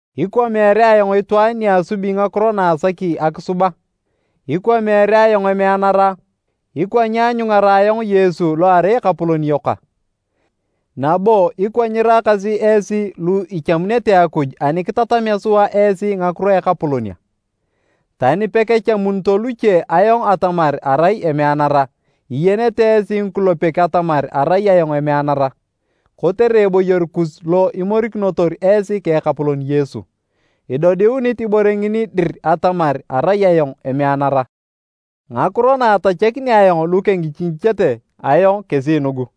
Ikwa meere ayong itwaan ni asubi ngakiro na asaki akisub a? Ikwa meere ayong emeanara a? Ikwa nyeanyungara ayong Yesu lo erai Ekapolon yok a? Nabo ikwa nyiraakasi esi lu ichamunete Akuj ani kitatamea sua esi ngakiro a Ekapolon a? Tani pekachamunito luche ayong atamar arai emeanara, iyenete esi ngikulepek atamar arai ayong emeanara! Kotere eboyor kus lo imorikinotor esi ka Ekapolon Yesu, idodiunit ibore ngini dir atamar arai ayong emeanara. Ngakiro na atachakini ayong lu kengichingichete ayong kesi nugu.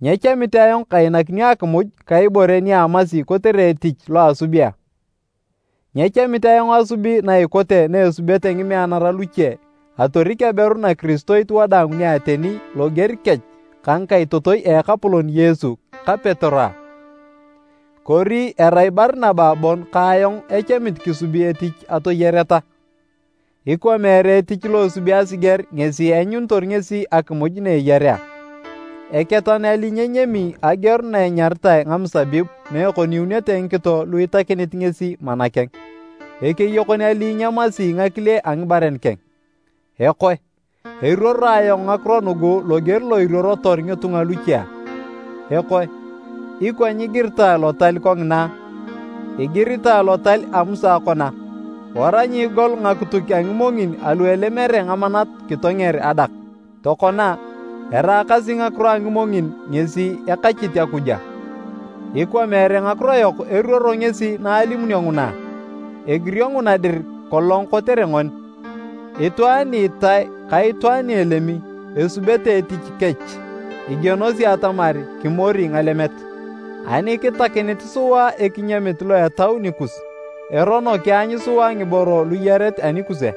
Nyechamit ayong kainakinio akimuj ka ibore ni amasi kotere etich lo asubi a? Nyechamit ayong asubi na ikote na esubete ngimeanara luche atorik aberu nakiristoit wadaang ni ateni loger kech ka ngikaitotoi a Ekapolon Yesu ta Petero a? Kori erai Barinaba bon ka ayong echamit kisubi etich atoyareta? Ikwa meere etich lo esubi asiger ngesi eanyunitor ngesi akimuj na eyarea a? Eketan ali nyenyami ageor na enyaritae ngamusabib na ekoniunete ngikito lu itakinit ngesi mana keng? Ekeyokon ali nyemasi ngakile a ngibaren keng? Ekoe, eruoro ayong ngakiro nugu loger lo iruorotor ngitunga luche a? Ekoe, ikwa nyigiritae Lotal kongina a? Igiritae Lotal lo a Musa kona, “Wara nyiigol ngakituk a ngimongin alu elemere ngamanat kitonger adak.” Tokona, eraakasi ngakiro a ngimongin ngesi ekachit Akuj a? Ikwa meere ngakiro yok eruoro ngesi naalimunio nguna a? Egirio nguna dir kolong kotere ngoni. Itwaan ni itae ka itwaan ni elemi, esubete etich kech igienosi atamar kimori ngalemet. Ani kitakinit sua ekinyamit lo etau nikus, erono kianyu sua ngiboro luyaret anikus a?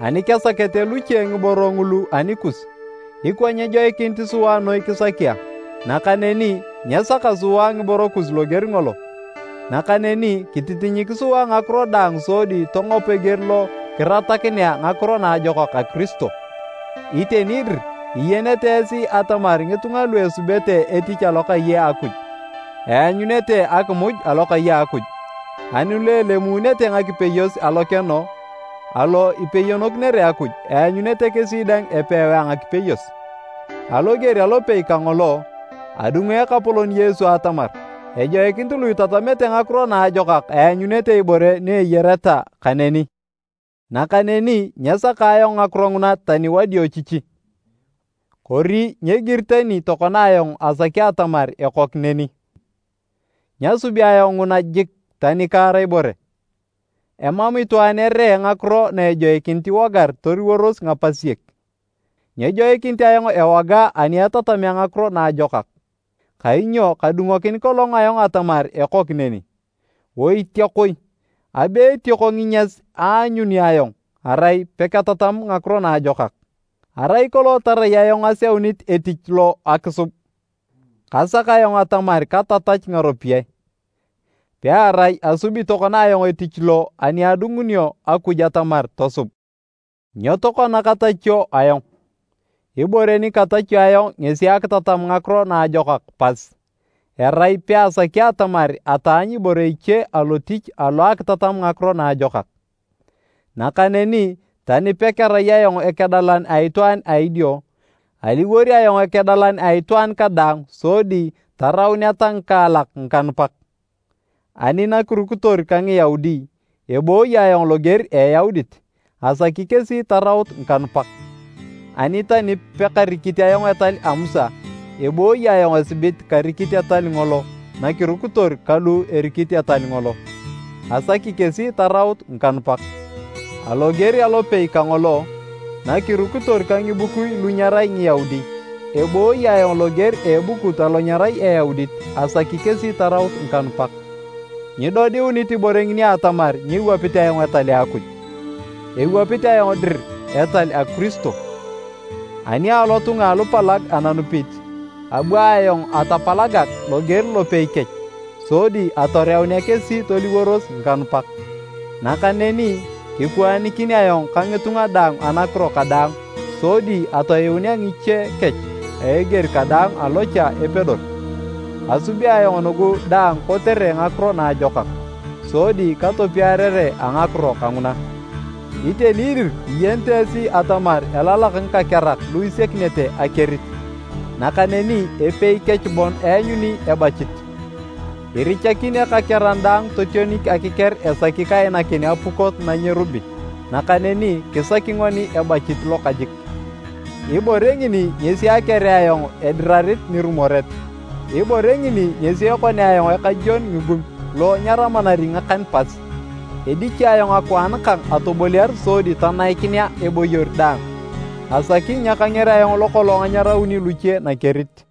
Ani kesakete luche ngiboro ngulu anikus, ikwa nyejoikinit sua noi kisaki a? Nakaneni nyesaka sua ngiboro kus loger ngolo. Nakaneni kititinyik sua ngakiro daang sodi tongop eger lo kiratakinea Ngakiro Naajokak a Kiristo. Iteni dir iyenete esi atamar ngitunga lu esubete etich alokai a Akuj, eanyunete akimuj alokai a Akuj, ani lu elemunete ngakipeyos alokeno alo ipeyonokinere Akuj, eanyunete kesi dang epewae a ngakipeyos. Aloger alopei kangolo, adungu Ekapolon Yesu atamar ejoikinit lu itatamete Ngakiro Naajokak eanyuununete ibore ni eyareta kaneni. Nakaneni nyesaka ayong ngakiro nguna tani wadiochichi, kori nyegiri tani tokona ayong asaki atamar ekok neni. Nyasubi ayong nguna jik tani kaar ibore! Emam itwaan eree ngakiro na ejoikinit iwogar toliworos ngapasiek. Nyejoikinit ayong ewoga ani etatamea Ngakiro Naajokak. Kainyo kadungokin kolong ayong atamar ekok neni. Oitiakoi! Abe etioko nginyas aanyuni ayong erai peketatam Ngakiro Naajokak! Arai kolong tarai ayong aseunit etich lo akisub, kasak ayong atamar katatach ngaropiyae, pearai asubi tokona ayong etich lo ani adungunio Akuj atamar tosub. Nyo tokona katachio ayong? Ibore ni katachio ayong ngesi akitatam Ngakiro Naajokak pas, erai peasaki atamar ataanyu ibore iche alotich alo akitatam Ngakiro Naajokak. Nakaneni, tani pekarai ayong ekedalan a itwaan a idio, aliwor ayong ekedalan a itwaan kadaang sodi tarauneta ngikaalak ngikanupak. Ani nakirukitor ka Ngiyaudi, ebooyi ayong loger a Eyaudit, asaki kesi taraut ngikanupak. Ani tani pekarikit ayong Etal a Musa, ebooyi ayong asibit karikit etal ngolo nakirukitor ka lu erikit etal ngolo, asaki kesi taraut ngikanupak. Aloger alopei kangolo, nakirukitor ka ngibukui lu nyerai Ngiyaudi, ebooyi ayong loger a ebukut alo nyerai Eyaudit asaki kesi taraut ngikanupak. Nyidodiunit ibore ngini atamar nyewapit ayong Etal a Akuj, ewapit ayong dir etal a Kiristo. Ani alotunga alupalag ananupit, abu ayong atapalagag loger lopei kech sodi atoreunea kesi toliworos ngikanupak. Nakaneni, kikwaanikin ayong ka ngitunga daang anakiro kadaang sodi atoyuunea ngiche kech a eger kadaang alo cha epedor. Asubi ayong nugu daang kotere Ngakiro Naajokak, sodi katopiarere a ngakiro kanguna. Iteni dir iyenete esi atamar elalak ngikakerak lu isiakinete akerit, nakaneni epei kech bon eanyuni ebachit. Irichakin ekakeran daang totionik akiker esaki kainakin apukot na nyerubi, nakaneni kisaki ngoni ebachit lokajik. Ibore ngini ngesi akerea ayong edirarit nirumoret, ibore ngini ngesi ekonea ayong ekajwon ngigum lo nyaramanari ngakan pas. Edichi ayong akwaan kang atoboliar sodi tanaikinea eboyor daang, asaki nyakanger ayong lokolong anyarauni luche nakerit.